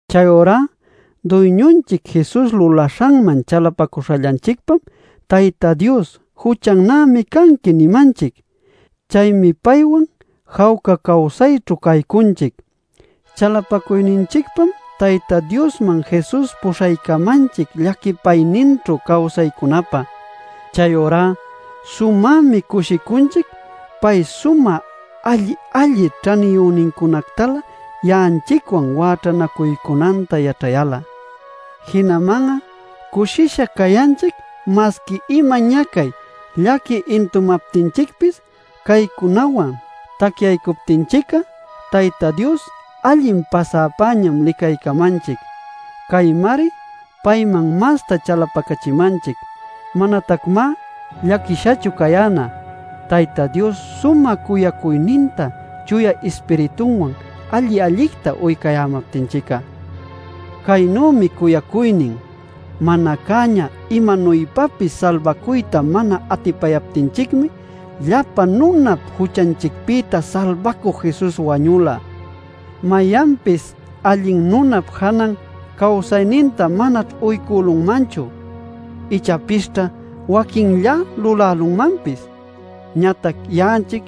Chayurá Duyñunchic Jesus lulaśhanman chalapacuśhallanchicpam, Tayta Dios “Juchannämi canqui” nimanchic. Chaymi paywan jawca cawsayćhu caycunchic. Chalapacuyninchicpam Tayta Diosman Jesus puśhaycamanchic llaquipayninćhu cawsaycunapä. Chayurá sumämi cushicunchic pay sumä alli-alli ćhaniyünincunactalä ya'anchicwan wäćhanacuycunanta yaćhayal'a. Jinaman'a cushisha cayanchic masqui ima ñacay, llaqui intumaptinchicpis caycunawan tacyaycachimänanchicta yaćhayalmi. Tacyaycuptinchic'a Tayta Dios allin pasäpäñam licaycamanchic. Caymari payman masta chalapacachimanchic. Manatacmá llaquishachu cayäna, Tayta Dios sumä cuyacuyninta Chuya Ispiritunwan alli-allicta uycayämaptinchic'a. Caynümi cuyacuynin: Mana cäña imanuypapis salbacuyta mana atipaptinchicmi, llapa nunap juchanchicpïta Salbacü Jesus wañula. Mayanpis allin nunap janan cawsayninta manaćh uycülunmanchu. Ichapisćha waquinllá lulälunmanpis. Ñatac ya'anchic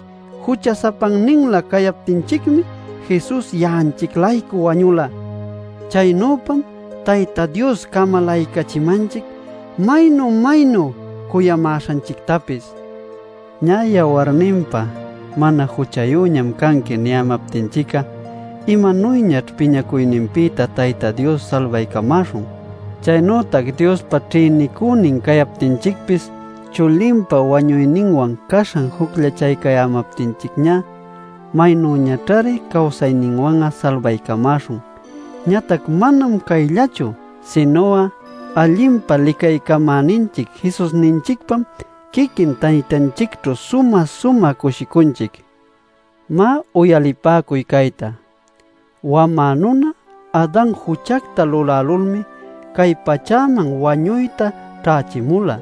jucha-sapanninlä cayaptinchicmi Jesus ya'anchic-laycu wañula. Chaynüpam Tayta Dios camalaycachimanchic maynu-maynu cuyamäśhanchictapis. Ñä, yawarninpa “mana juchayüñam canqui” niyämaptinchic'a ¡maynüñaćh piñacuyninpïtá Tayta Dios salbaycamäśhun! Chaynütac Diospa ćhïnicünin cayaptinchicpis chulinpa wañuyninwan caśhan jucllachayämaptinchicñá ¡maynüñaćhari cawsayninwan'a salbaycamäśhun! Ñatac manam cayllachu, sinu'a allinpa licaycachimäninchic Jesusninchicpam quiquin Taytanchicćhu sumä-sumä cushicunchic. Má, uyalipäcuy cayta: Wamä nuna Adan juchacta lulälulmi cay pachäman wañuyta ćhächimula.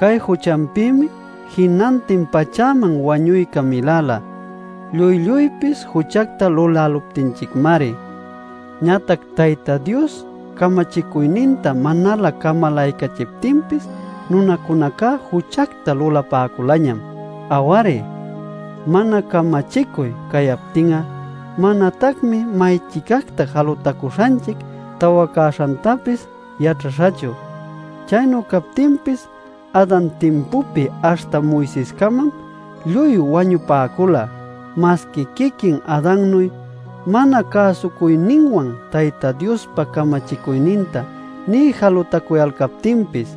Cay juchanpïmi jinantin pachäman wañuyca miläla, lluy-lluypis juchacta luläluptinchicmari. Ñatac Tayta Dios camachicuyninta manalä camalaycachiptinpis nunacunaca juchacta lulapäculañam. Aw-ari, mana camachicuy cayaptin'a manatacmi may-chicacta jalutacuśhanchic tawacäśhantapis yaćhaśhachu. Chaynu captinpis Adan timpupi aśhta Moisescamam lluy wañupäcula, masqui quiquin Adannuy mana cäsucuyninwan Tayta Diospa camachicuyninta nï jalutacuyalcaptinpis.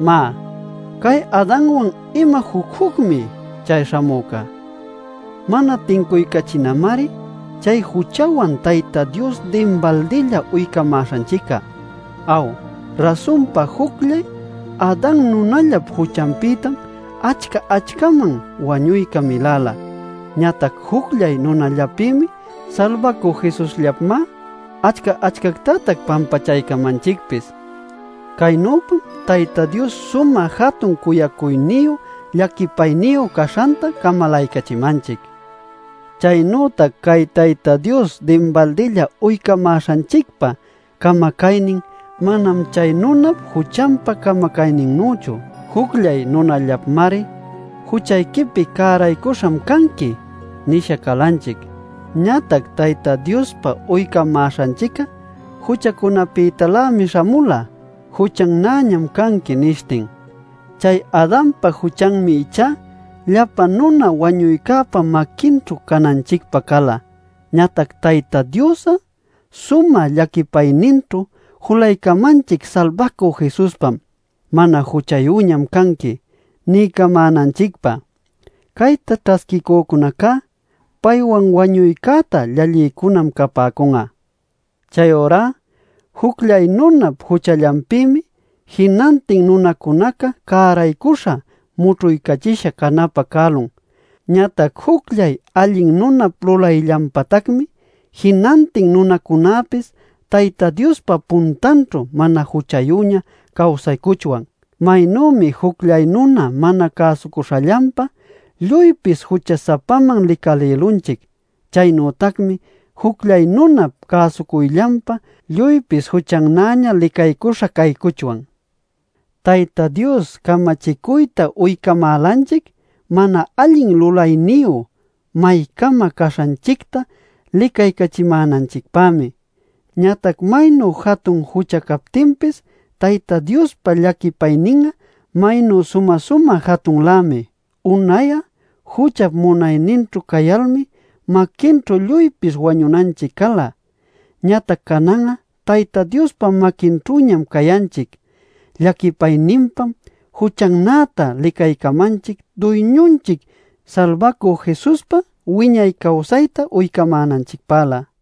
Má ¡cay Adanwan ima juc-jucmi chay śhamüca! Mana tincuycachinamari chay juchawan Tayta Dios dinbaldilla uycamäśhanchic'a. Aw, rasunpa jucllay Adan nunallap juchanpïtam achca-achcaman wañuyca miläla. Ñatac jucllay nunallapmi, Salbacü Jesusllapmá, achca-achcactatac pampachaycamanchicpis. Caynüpam Tayta Dios sumä jatun cuyacuyniyu llaquipayniyu caśhanta camalaycachimanchic. Chaynütac cay Tayta Dios dinbaldilla uycamäśhanchicpa camacaynin manam chay nunap juchanpa camacayninnüchu. Jucllay nunallapmari “Juchayquipi cäraycuśham canqui” nisha calanchic. Ñatac Tayta Diospa uycamäśhanchic'a juchacunapïtalämi śhamula, “Juchannäñam canqui” nishtin. Chay Adanpa juchanmi ichá llapa nuna wañuycäpa maquinćhu cananchicpä cala. Ñatac Tayta Dios'a sumä llaquipayninćhu julaycamanchic Salbacü Jesuspam “Mana juchayüñam canqui” niycamänanchicpä. Cayta ćhasquicücunacá paywan wañuycäta llallïcunam capäcun'a. Chayurá jucllay nunap juchallanpïmi jinantin nunacunaca cäraycuśha mućhuycachisha canapä cälun. Ñatac jucllay allin nunap lulayllanpatacmi jinantin nunacunäpis Tayta Diospa puntanćhu mana juchayüña cawsaycuchwan. Maynümi jucllay nuna mana cäsucuśhallanpa lluypis jucha-sapaman licalïlunchic, chaynütacmi jucllay nunap cäsucuyllanpa lluypis juchannäña licaycuśha caycuchwan. Tayta Dios camachicuyta uycamälanchic mana allin lulayniyu maycama caśhanchicta licaycachimänanchicpämi. Ñatac maynu jatun jucha captinpis Tayta Diospa llaquipaynin'a maynu sumä-sumä jatunlämi. Unay'a juchap munayninćhu cayalmi maquinćhu lluypis wañunanchic cala. Ñatac canan'a Tayta Diospa maquinćhüñam cayanchic; llaquipayninpam “juchannäta” licaycamanchic Duyñunchic Salbacü Jesuspa wiñay cawsayta uycamänanchicpälä.